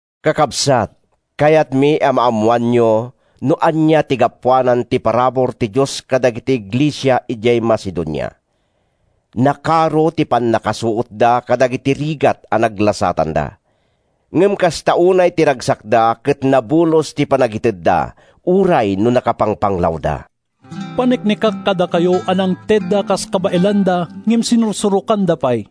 Kakabsat, kayatmi a maammoanyo no ania ti gapuanan ti parabur ti Dios kadagiti iglesia idiay Macedonia. Nakaro ti pannakasuotda kadagiti rigat a naglasatanda. Ngem kasta unay ti ragsakda ket nabulos ti panagitedda uray no nakapangpanglawda. Paneknekak kadakayo a nangtedda kas kabaelanda ngem sinursurokanda pay.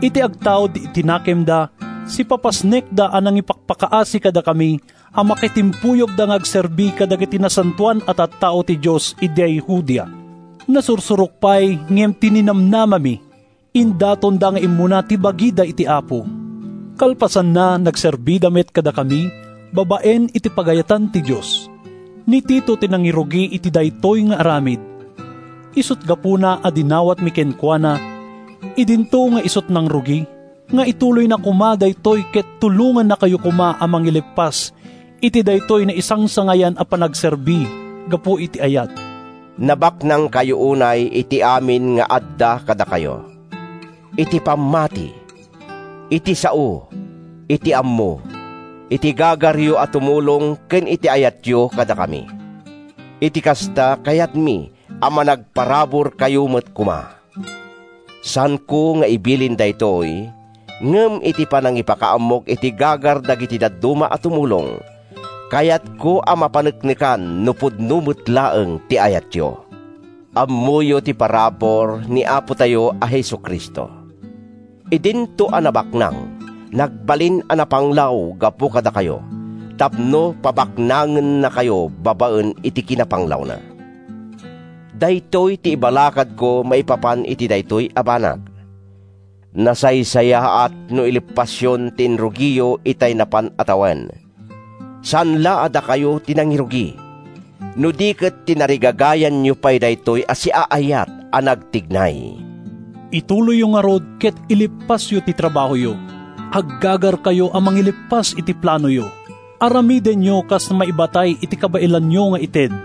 Iti agtaud iti nakemda, sipapasnekda a nangipakpakaasi kadakami a makitimpuyogda nga agserbi kadagiti nasantoan a tattao ti Dios idiay Judea. Nasursurok pay ngem ti ninamnamami! Indatonda nga immuna ti bagida iti Apo. Kalpasanna, nagserbida met kadakami, babaen iti pagayatan ti Dios. Ni Tito ti nangirugi iti daytoy nga aramid. Isut’ gapuna a dinawatmi kenkuana, idinto nga isut’ nangrugi, nga ituloyna koma daytoy ket tulongannakayo koma a mangileppas iti daytoy naisangsangayan a panagserbi gapu iti ayat. Nabaknangkayo unay iti amin nga adda kadakayo: iti pammati, iti sao, iti ammo, iti gagaryo a tumulong ken iti ayatyo kadakami. Iti kasta, kayatmi a managparaburkayo met koma. Saanko nga ibilin daytoy. Ngem iti panangipakaammok iti gagar dagiti dadduma a tumulong, kayatko a mapaneknekan no pudno met laeng ti ayatyo. Ammoyo ti parabur ni Apotayo a Jesu-Cristo: Idinto a nabaknang, nagbalin a napanglaw gapu kadakayo tapno pabaknangennakayo babaen iti kinapanglawna. Daytoy ti ibalakadko maipapan iti daytoy a banag: Nasaysayaat no ileppasyon ti inrugiyo itay napan a tawen. Saan la a dakayo ti nangirugi, no di ket tinarigagayanyo pay daytoy a siaayat a nagtignay. Ituloyyo ngarud ket ileppasyo ti trabahoyo! Aggagarkayo a mangileppas iti planoyo. Aramidenyo kas maibatay iti kabaelanyo nga ited.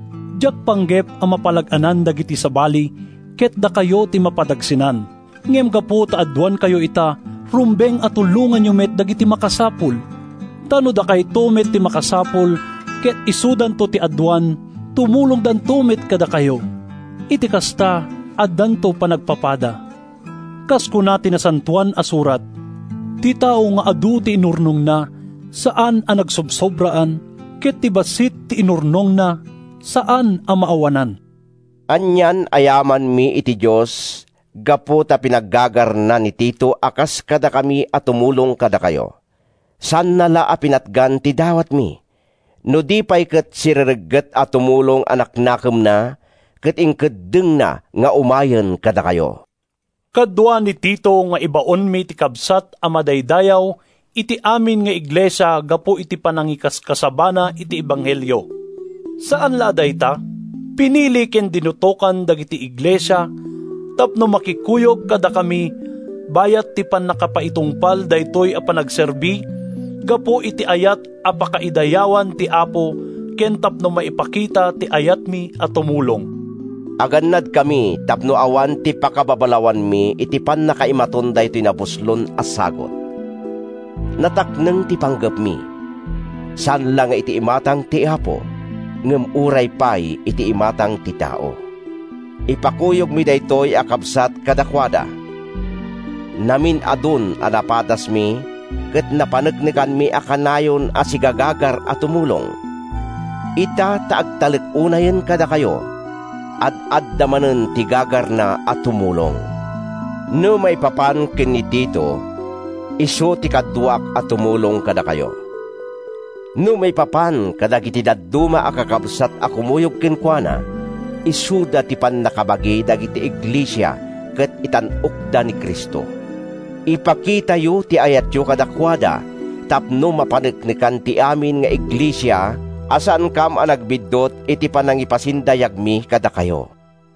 Diak panggep a mapalag-anan dagiti sabali ket dakayo ti mapadagsenan. Ngem gapu ta aduankayo ita, rumbeng a tulonganyo met dagiti makasapul. Ta no dakayto met ti makasapul ket isudanto ti aduan tumulongdanto met kadakayo. Iti kasta, addanto panagpapada. Kas kuna ti Nasantoan a Surat: “Ti tao nga adu ti inurnongna, saan a nagsobsobraan, Ket ti bassit ti inurnongna, saan a maawanan.” Anian a yamanmi iti Dios gapu ta pinaggagarna ni Tito a kas kadakami a tumulong kadakayo. Saanna la a pinatgan ti dawatmi, no di pay ket sireregget a tumulong a naknakemna ket inkeddengna nga umayen kadakayo. Kadua ni Tito nga ibaonmi ti kabsat a madaydayaw iti amin nga iglesia gapu iti panangikaskasabana iti ebanghelio. Saan la a dayta, pinili ken dinutokan dagiti iglesia tapno makikuyog kadakami bayat ti pannakaipatungpal daytoy a panagserbi gapu iti ayat a pakaidayawan ti Apo ken tapno maipakita ti ayatmi a tumulong. Agannadkami tapno awan ti pakababalawanmi iti pannakaimaton daytoy nabuslon a sagut. Natakneng ti panggepmi, saan la nga iti imatang ti Apo, ngem uray pay iti imatang ti tao. Ipakuyogmi daytoy a kabsat kadakuada. Namin-adun a napadasmi ket napaneknekanmi a kanayon a sigagagar a tumulong. Ita ta agtalek unayen kadakayo, ad-adda manen ti gagarna a tumulong. No maipapan ken ni Tito, isu ti kaduak a tumulong kadakayo. No maipapan kadagiti dadduma a kakabsat a kumuyog kenkuana, isuda ti pannakabagi dagiti iglesia ket itan-okda ni Cristo. Ipakitayo ti ayatyo kadakuada tapno mapaneknekan ti amin nga iglesia a saankam a nagbiddut iti panangipasindayagmi kadakayo.